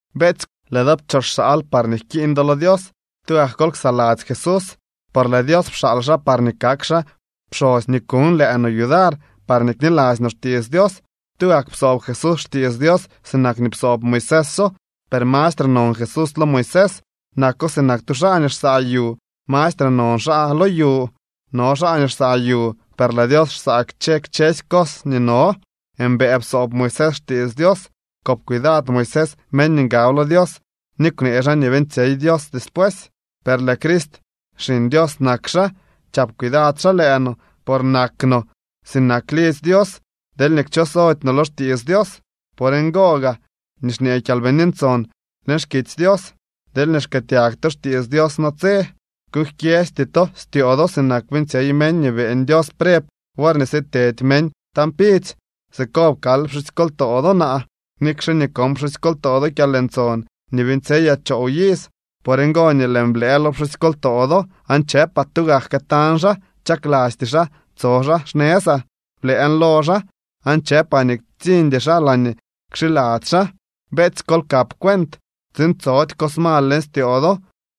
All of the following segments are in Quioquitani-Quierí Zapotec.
Beetsy, lëë do pchooxaal par jkiiñ do lo Dios. Tugak kol ksaladzy Jesús, por lëë Dios pxaal xaa parñee kak xaa pxosy nii kuñ lëë no yudar parñee kniladzy no xtiits Dios. Tugak psoob Jesús xtiits Dios sinak nii psoob Moiséso. Per mastre non Jesús lo Moisés. Nako sinak tu xaa nii xsaa yu. Mastre non xaa lo yu. No xaa nii xsaa yu, per lëë Dios xsaa kchë kchësy cos nii no. Mbëë psoob Moisés xtiits Dios. Kop cuidad Moisés meñ nii ngab lo Dios ni kwnee xaa nii beeñtsyey Dios despuesy. Per lëë Crist, Xiñ Dios nak xaa. Chap cuidad xaa lëë no, por nak no sinak lidzy Dios deelñee kchosody no lo xtiits Dios. Por ngo gaa nii xñee Kyalbini Ntson leñ xkitsy Dios: Deelñee xkëëtyag to xtiits Dios natse, kuuñ jkyeesty to styoo do sinak beeñtsyey meñ nii beeñ Dios preb worñee sitedy meñ tañ pidzy. Siko pkaal pxusykoltoo do naa, nikxe nii kon pxusykoltoo do kyalntson nii beeñtsyeyaa choow iz. Por ngo nii lëën blëë lo pxusykoltoo do aan chëpaa: “Tugak këtañ xaa. Chaklasty xaa tso xaa xnëzaa.” Blëën lo xaa, aan chëpaa nii ktsiñdy xaa laañee kxiladzy xaa. Beetsy, kol kap cuent tsiin tsody cos mal leñ styoo do,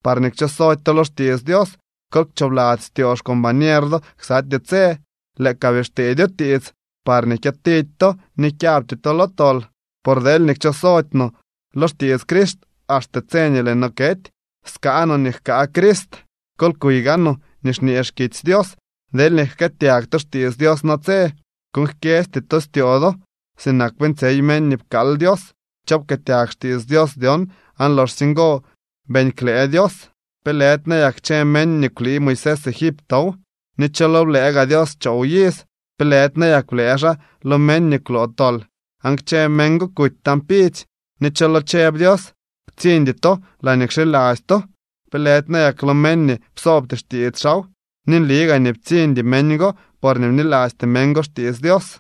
parñee kchosody to lo xtiits Dios. Kol kchoobladzy styoo xcombañer do ksatyee tse, lëë ka bii xtedyo tiits, parñee kyëtidy to ni kyabty to lo tol. Por deelñee kchosody no lo xtiits Crist axte tse nii lëë no kety, skaa no nii jkaa Crist. Kol kuy gaanoo nii xñee xkitsy Dios: Deelñee jkëëtyag to xtiits Dios natse, kuuñ jkyesty to styoo do sinak beeñtsyey meñ nii pkaal Dios. ¿Cho pkëëtyag xtiits Dios dyon aan loxsye ngo beeñ klëë Dios? ¿Pe lëdy nayak kchë meñ nii kwlii Moisés Egiptow? ¿Ni cho lo blëë gaa Dios choow iz? ¿Pe lëdy nayak blëë xaa lo meñ nii kwloo tol? Aan kchë meñ go kuty tañ pidzy. ¿Ni cho lo chëb Dios: “Ktsiñdy to laañee kxiladzy to”? ¿Pe lëdy nayak lo meñ nii psoobty xtiits xaaw? Ni nli gaa nii ptsiñdy meñ go, porñee bnilasty meñ go xtiits Dios.